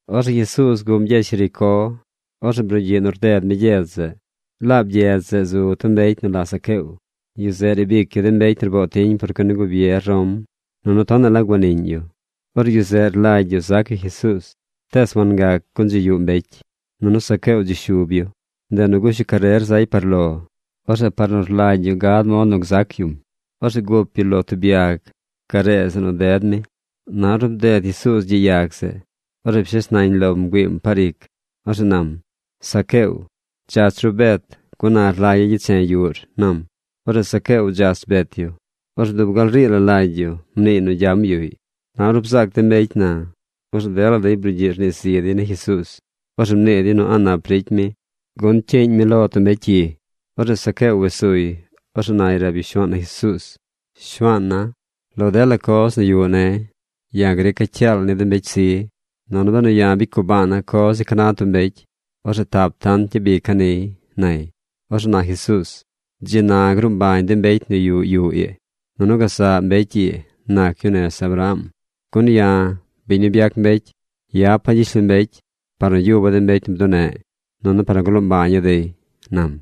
Orzeꞌ Jesuuz guꞌm gyedz Jericó. Orzeꞌ brugyiꞌ nu rded mi gyedz zeꞌ. Laab gyedz zeꞌ zu tub mbecy nu la Zaqueo. Yu zeꞌ riib ic yu de mbecy nu rboo tiñ por cuen ni gubier Rom. Nunu tonaꞌ la guaniꞌñ yu. Orzeꞌ yu zeꞌ rlagy yu zac yu Jesuuz, tees wangac gun dzi yuꞌ mbecy. Nunu Zaqueo dzi shub yu. Ndeꞌ nu gush yu carer zay par lo. Orzeꞌ par nu rlagy yu gad mod nu gzac yum, orzeꞌ gup yu lo tub yag garee zeꞌ nu ded mi. Na ornu bded Jesuuz gyiꞌ yag zeꞌ, orzeꞌ pshes nañ lom bgüiim par ic. Orzeꞌ nam: ―Zaqueo, dzach ru bet, gun na rlagya̱ gyeche̱ yuꞌr ―nam. Orzeꞌ Zaqueo dzach bet yu. Orzeꞌ dub gal rii la lagy yu mniiy nu gyam yuꞌy. Na ornu bzaac de mbecy na, orzeꞌ dela dey brugyiꞌ rnii zi dey ni Jesuuz. Orzeꞌ mnii dey nu a̱ꞌ nap ricy mi, gun cyiiñ mi lo tub mbecy cyi. Orzeꞌ Zaqueo wes suy. Orzeꞌ nay rab yu Shuaan na Jesuuz: ―Shuaana̱, lo dela coz nu yuꞌ ne̱, ya̱ grica̱ cyaal ni de mbecy zi, nunu benu ya̱ bicy gubaana̱ coz ni ca na tub mbecy, orzeꞌ tap tant gyabica̱ niy ―nay. Orzeꞌ na Jesuuz: ―Dzi na gruu mbañ de mbecy nu yuꞌ yuꞌ ii. Nunu gazaꞌ mbecy ii nac yu nez Abraham. Gun ya̱, biñ nu byac mbecy, yapa̱ gyishlombecy par nu yuba̱ de mbecy nu bduneꞌ, nunu par nu gloo mbaña̱ dey ―nam.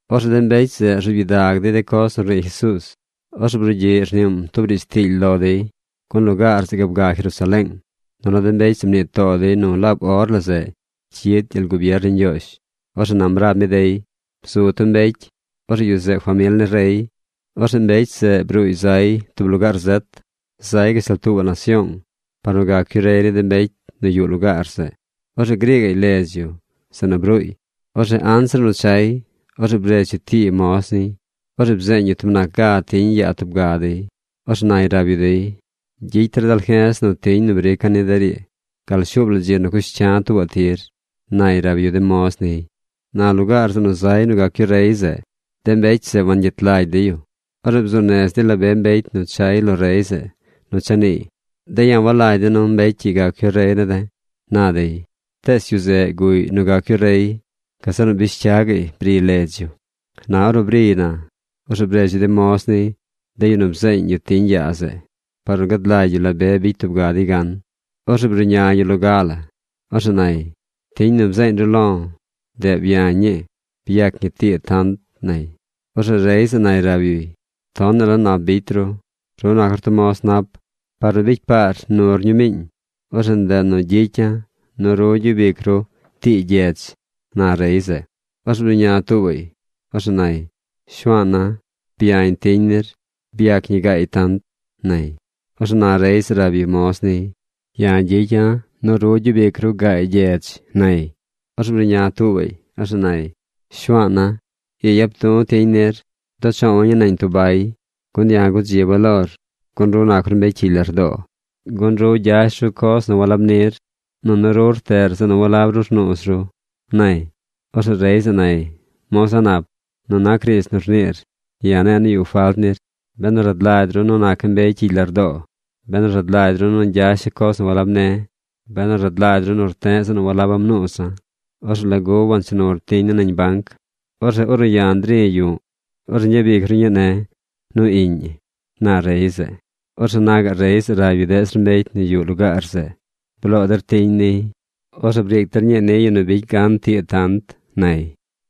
Orzeꞌ de mbecy zeꞌ rzuub gyidag dey de coz nu rnii Jesuuz. Orzeꞌ brugyiꞌ rniim tub riidz tiily lo dey, gun lugaar zeꞌ gaab ga Jerusaleeng, nunu de mbecy zeꞌ mnii too dey nu laab or la zeꞌ cyid gyel gubier ni Ñgyoozh. Orzeꞌ nam rab mi dey: ―Bzu tub mbecy. Orzeꞌ yu zeꞌ famil ni rey. Orzeꞌ mbecy zeꞌ bruuy zay tub lugaar zet. Zay gashtal tuubaꞌ nasyoong par nu gac yu rey ni de mbecy nu yuꞌ lugaar zeꞌ. Orzeꞌ grii gaꞌy ledz yu zeꞌ nu bruuy. Orzeꞌ anzir nu chay, orzeꞌ bredz yu tii moz niy. Orzeꞌ bzeeñ yu tub nac gaa la tiñ yaa tub ga dey. Orzeꞌ nay rab yu dey: “Gyicy der dalje̱z nu de tiñ nu brica̱ ni der ii gal shuub la dzi nu cush cya̱ tuubaꞌ tir”, nay rab yu de moz niy. Na lugaar zeꞌ nu zay nu gac yu rey zeꞌ, de mbecy zeꞌ wangyet lagy dey yu. Orzeꞌ bzuu nez dey la be mbecy nu chay lo rey zeꞌ nu cha niiy: “De̱ ya̱ walagy de̱ nu mbecy ii gac yu rey ne̱ de̱”, na dey. ’Tees yu zeꞌ guꞌy nu gac yu rey. Gazeꞌ nu bish cya gaꞌy briy ledz yu. Na ornu briy na, orzeꞌ bredz yu de moz niy, de yu nu bzeeñ yu tiñ yaa zeꞌ, par nu gad lagy yu la be bicy tub ga dey gan. Orzeꞌ bruꞌña mbecy loga la. Orzeꞌ nay: “Tiñ nu bzeeñ ru lo̱, ndeꞌ byañ ñii. Byac ñi tii tant”, nay. Orzeꞌ rey zeꞌ nay rab yuy: “Nap tonaꞌ la bicy ru. Ru nac ru tub moz nap. Par nu ru bicy paar nur ñumiiñ, orzeꞌ ndeꞌ nu gyicya̱ nu ru gyub ic ru tii gyedz”, na rey zeꞌ. Orzeꞌ bruꞌña tuubaꞌy. Orzeꞌ nay: “Shuaana̱, byañ tiñ nir. Byac ñi gaay tant”, nay. Orzeꞌ na rey zeꞌ rab yu moz niy: “Ya̱ gyicya̱ nu ru gyub ic ru gaay gyedz”, nay. ’Orzeꞌ bruꞌña tuubaꞌy. Orzeꞌ nay: “Shuaana̱, ii yap du̱ tiñ nir. Bduꞌ choowa̱ ñii nañ tub bay. Gun ya̱ gudziba̱ lor, gun ru nac ru mbecy cyigy lardoo, gun ru gyash ru coz nu walab nir, nunu ru rteꞌr zeꞌ nu walab ru rnuuz ru”, nay. Orzeꞌ rey zeꞌ nay: “Moz a̱ꞌ nap, nu nac riidz nu rniir ya̱ ne̱e̱ nu yuꞌ falt nir. Benu rad lagy ru nu naca̱ mbecy cyigy lardoo, benu rad lagy ru nu gyasha̱ coz nu walab ne̱, benu rad lagy ru nu rte̱ꞌ zeꞌ nu walaba̱ mnuuza̱, ¿orzeꞌ lagu wancha nur tiñ ne̱ nañ banc? Orzeꞌ ornu ya̱ nri̱ yu̱ꞌ, orzeꞌ ñgyabic ru ne̱ nu iꞌñ ñi”, na rey zeꞌ. Orzeꞌ na gaꞌ rey zeꞌ rab yu deꞌ zir mbecy nu yuꞌ lugaar zeꞌ: “Bloo der tiñ niy. Orzeꞌ briic der ñii ni yu nu bicy gan tii tant”, nay.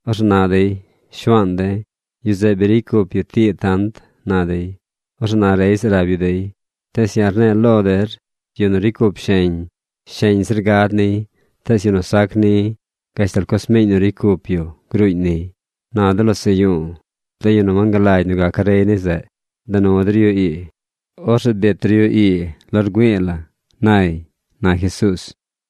Orzeꞌ na dey: “Shuaan de̱, yu zeꞌ bi ricy cup yu tii tant”, na dey. Orzeꞌ na rey zeꞌ rab yu dey: “Tees ya̱ rne̱e̱ lo der nu yu nu ricy cup sheñ, sheñ zir gad niy. Tees yu nu sac ni, gashtal coz miiñ nu ricy cup yu gruuñ niy. Na de losaꞌ yu̱u̱, de yu nu wangalagy nu gaca̱ rey ni zeꞌ, da nu der yu ii. Orzeꞌ biit der yu ii lo rgüi̱i̱ la̱”, nay ―na Jesuuz.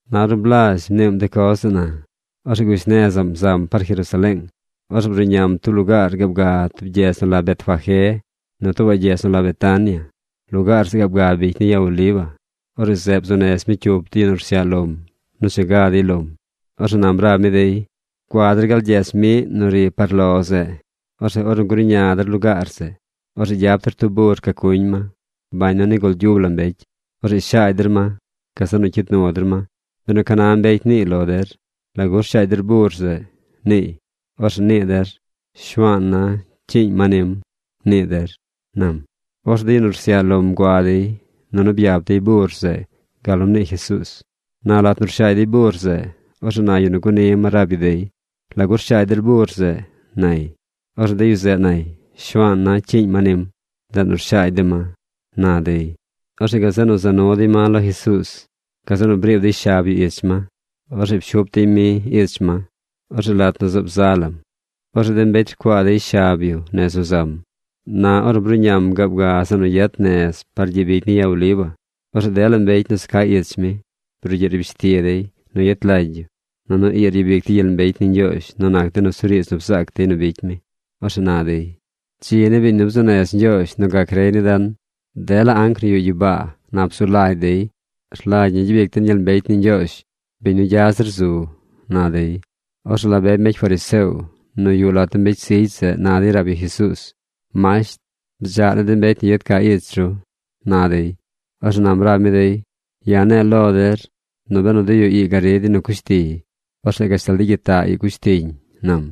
Na ornu blazh mniim de coz zeꞌ na, orzeꞌ gush nezaꞌm zam par Jerusaleeng. Orzeꞌ bruꞌñam tub lugaar gaab ga tub gyedz nu la Betfagé nu tuubaꞌ gyedz nu la Betania. Lugaar zeꞌ gaab ga bicy ni Ya Oliva. Orzeꞌ zeꞌ bzuu nez mi cyup de yu nu rsyaꞌ lom nu cha ga dey lom. Orzeꞌ nam rab mi dey: ―Gua der gal gyedz miꞌ nu ri par lo zeꞌ. Orzeꞌ ornu gruꞌña der lugaar zeꞌ, orzeꞌ gyap der tub bur ca cuñ ma, bañ nu nigul gyub la mbecy. Orzeꞌ shaagy der ma. Gazeꞌ nu cyid nu der ma. Benu ca na mbecy niiy lo der: “¿Lagu rshaagy der bur zeꞌ?” niiy, orzeꞌ nii der, “Shuaan na cyiiñ ma nim”, nii der ―nam. Orzeꞌ de yu nu rsyaꞌ lom gua dey, nunu byap dey bur zeꞌ gal nu mnii Jesuuz. Na lat nu rshaagy dey bur zeꞌ, orzeꞌ na yu nu guni ma rab yu dey: ―¿Lagu rshaagy der bur zeꞌ? ―nay. Orzeꞌ de yu zeꞌ nay: ―Shuaana̱ cyiiñ ma nim. Ndeꞌ nu rshaagy de̱ ma ―na dey. Orzeꞌ gazeꞌ nu za nu dey ma lo Jesuuz. Gazeꞌ nu briib dey shab yu ich ma. Orzeꞌ pshup dey mi ich ma. Orzeꞌ lat nu zaab za lam, orzeꞌ de mbecy rcuaa dey shab yu nez nu zam. Na ornu bruꞌñam gaab ga zeꞌ nu gyet nez par gyiꞌ bicy ni Ya Oliva, orzeꞌ dela mbecy nu za ca ich mi brugyiꞌ nu rbish ti dey nu yet lagy yu. Nunu ii ryabic dey gyel mbecy ni Ñgyoozh nu nac de nusuriidz nu bzaac dey nu bicy mi. Orzeꞌ na dey: ―¡Dzi ni biñ nu bzuu nez Ñgyoozh nu gac rey ni den! ¡Dela anc nu yuꞌ gyibaa nap zu lagy dey! ¡Rlagy ñi gyabic den gyel mbecy ni Ñgyoozh, biñ nu gya zir zu! ―na dey. Orzeꞌ la be mbecy fariseo nu yuꞌ lat de mbecy zigy zeꞌ na dey rab yu Jesuuz: ―Masht, bdzaꞌ ni de mbecy nu yad ca ich ru ―na dey. Orzeꞌ nam rab mi dey: ―Ya̱ ne̱e̱ lo der nu benu de yu ii gari dey nu cush tiy, orzeꞌ gashtal de gyitaꞌ ii cush tiñ ―nam.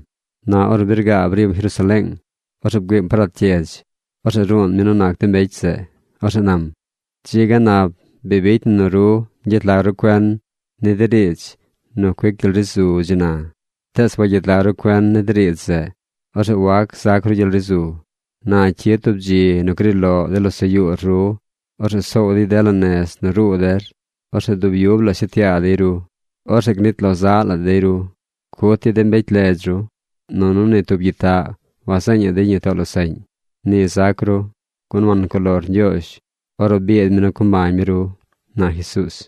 Na ornu bi rgaab rim Jerusaleeng, orzeꞌ bgüiim par lat gyedz. Orzeꞌ ruun mi nu nac de mbecy zeꞌ. Orzeꞌ nam: ―¡Dzi ga nap bicy na nu ru gyet lag ru cuen ni de riidz nu cuic gyel ri zu dzi na! Tees wagyet lag ru cuen ni de riidz zeꞌ. Orzeꞌ wac zac ru gyel ri zu. Na cyid tub dzi nu gri loꞌ de losaꞌ yuur. Orzeꞌ soow dey dela nez nu ruu der. Orzeꞌ dub yub la shet yaa dey ru. Orzeꞌ gnit lo zaꞌ la dey ru. Cut dey de mbecy ledz ru. Nunu ni tub gyitaꞌ wazeeñaꞌ dey ñi too losaꞌñ. Ni zac ru, gun wancuꞌ lor Ñgyoozh ornu biid mi nu co mbañ mi ru ―na Jesuuz.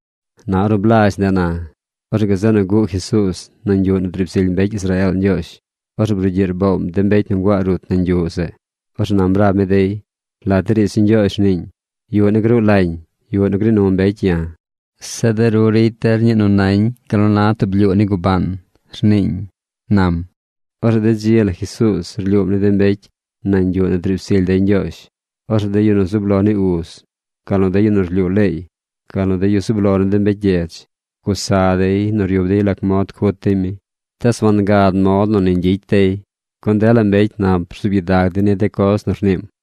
Na ornu blazh ndeꞌ na, orzeꞌ gazeꞌ nu guꞌ Jesuuz nañ yuꞌ nu driib zily mbecy Israeel Ñgyoozh. Orzeꞌ brugyiꞌ rboom de mbecy nu nguaa rut nañ yuꞌ zeꞌ. Orzeꞌ nam rab mi dey: ―Lat de riidz ni Ñgyoozh rniiñ: “Yuꞌ ne̱ gruu lañ yuꞌ nu gnii nu mbecy ya̱. Zeꞌ de ru ricy der ñii nu nañ gal na tub blyuu ni gubaan”, rniiñ ―nam. Orzeꞌ de dzi la Jesuuz rlyuum ni de mbecy nañ yuꞌ nu driib zily dey Ñgyoozh. Orzeꞌ de yu zub lo ni uz, gal nu de yu nu rlyuu leey, gal nu de yu zub lo ni de mbecy gyedz, gusa dey nu ryub dey lac mod cut dey mi. Tees wangad mod nu ni ñgyicy dey, gun dela mbecy nap rzuub gyidag dey ni de coz nu rniim.